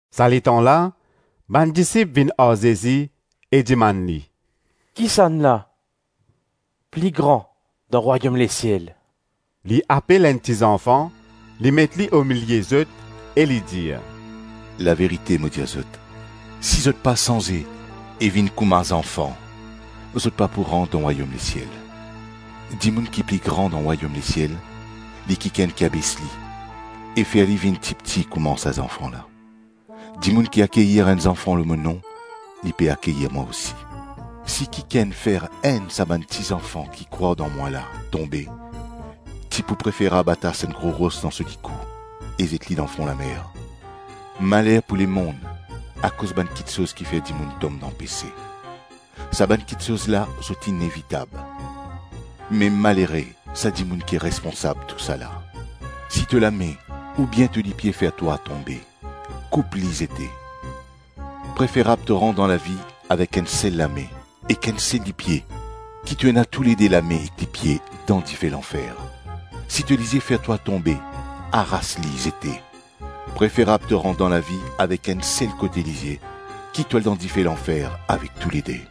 Sa letan la, bann disip vinn ar Zezi e dimann li, “Kisannla pli gran dan rwayom lesiel?” Li apel enn ti zanfan, li met li omilie zot, e li dir, “Laverite mo dir zot, si zot pa sanze e vinn kouma zanfan, zot pa pou rant dan rwayom lesiel. Dimoun ki pli gran dan rwayom lesiel li kikenn ki abes li e fer li vinn tipti kouma sa zanfan la. Dimoun ki akeyir enn zanfan lor mo nom, li pe akeyir mwa osi. Si kikenn fer enn sa bann ti zanfan ki krwar dan mwa la tonbe, ti pou preferab atas enn gro ros dan so likou e zet li dan fon lamer. Maler pou lemonn akoz bann kiksoz kifer dimoun tom dan pese. Sa bann kiksoz la zot inevitab, me malere sa dimoun ki responsab tousala. Si to lame oubien to lipie fer twa tonbe, koup li zete, preferab to rant dan lavi avek enn sel lame ek enn sel lipie ki to ena toulede lame ek lipie dan dife lanfer. Si to lizie fer twa tonbe, aras li zete; preferab to rant dan lavi avek enn sel kote lizie ki to al dan dife lanfer avek toulede.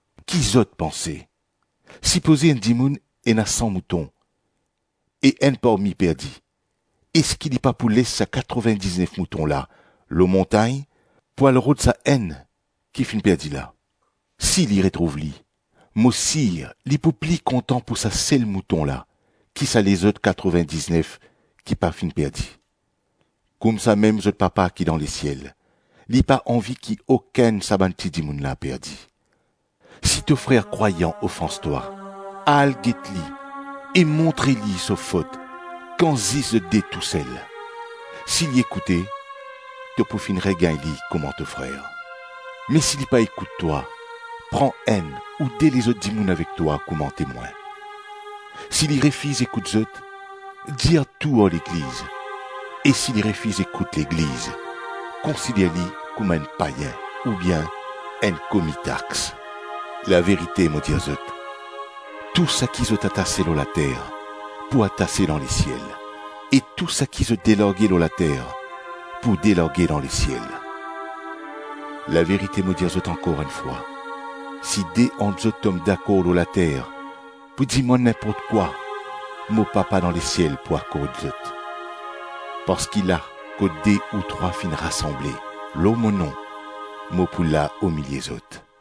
Ki zot panse? Sipoze enn dimoun ena san mouton, e enn parmi perdi, eski li pa pou les sa katrovin-diznef mouton la lor montagn pou al rod sa enn ki finn perdi la? Si li retrouv li, mo sir li pou pli kontan pou sa sel mouton la ki sa lezot katrovin-diznef ki pa finn perdi. Koumsamem zot Papa ki dan lesiel, li pa anvi ki okenn sa bann ti dimoun la perdi. Si to frer krwayan ofans twa, al get li e montre li so fot kan zis zot de tousel. Si li ekoute, to pou finn regagn li kouma to frer. Me si li pa ekout twa, pran enn ou de lezot dimoun avek twa kouma temwin. Si li refiz ekout zot, dir tou ar legliz; e si li refiz ekout legliz, konsider li kouma enn payin oubien enn komi tax. Laverite, mo dir zot, tou saki zot atase lor later pou atase dan lesiel, e tou saki zot delarge lor later pou delarge dan lesiel. Laverite mo dir zot ankor enn fwa, si de ant zot tom dakor lor later pou dimann ninport kwa, mo Papa dan lesiel pou akord zot. Parski la kot de ou trwa finn rasanble lor mo nom mo pou la omilie zot.”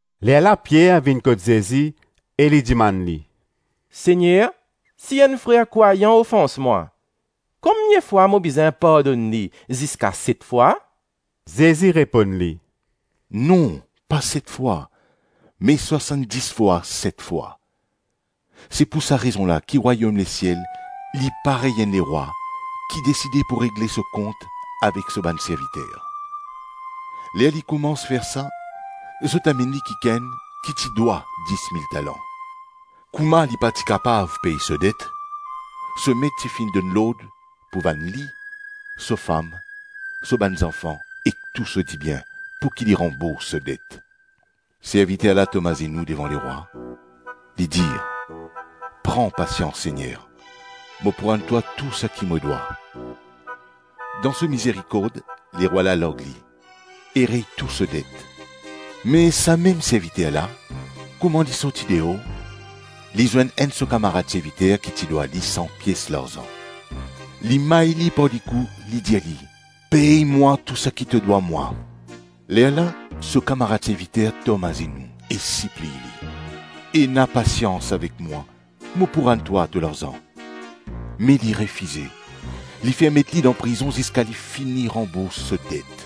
Lerla Pier vinn kot Zezi e li dimann li, “Segner, si enn frer krwayan ofans mwa, konbien fwa mo bizin pardonn li? Ziska set fwa?” Zezi reponn li, “Non pa set fwa, me swasann-dis fwa set fwa. Se pou sa rezon la ki rwayom lesiel li parey enn lerwa ki deside pou regle so kont avek so bann serviter. Ler li koumans fer sa, zot amenn li kikenn ki ti dwa dis mil talan. Kouma li pa ti kapav pey so det, so met ti finn donn lord pou vann li, so fam, so bann zanfan ek tou so dibien, pouki li ranbours so det. Serviter la tom azenou devan lerwa, li dir, ‘Pran pasians Segner, mo pou rann twa tou saki mo dwa.’ Dan so mizerikord, lerwa la larg li e rey tou so det. Me samem serviter la, kouma li sorti deor, li zwenn enn so kamarad serviter ki ti dwa li san pies larzan. Li may li par likou, li dir li, ‘Pey mwa tou saki to dwa mwa.’ Lerla so kamarad serviter tom azenou e sipliy li, ‘Ena pasians avek mwa, mo pou rann twa to larzan.’ Me li refize; li fer met li dan prizon ziska li fini ranbours so det.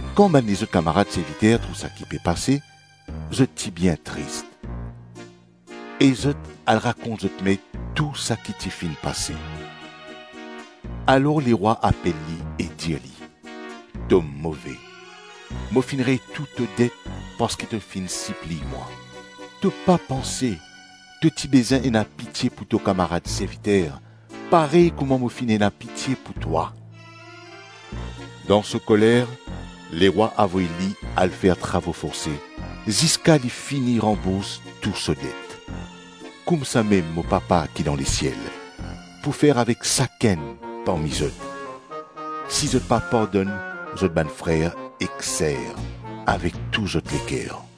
Kan bann lezot kamarad serviter trouv saki pe pase, zot ti bien tris, e zot al rakont zot met tou saki ti finn pase. Alor lerwa apel li e dir li, ‘To move! Mo finn rey tou to det parski to finn sipliy mwa. To pa panse to ti bizin ena pitie pou to kamarad serviter parey kouma mo finn ena pitie pou twa?’ Dan so koler, lerwa avoy li al fer travo forse ziska li fini ranbours tou so det. Koumsamem mo Papa ki dan lesiel pou fer avek sakenn parmi zot, si zot pa pardonn zot bann frer ek ser avek tou zot leker.”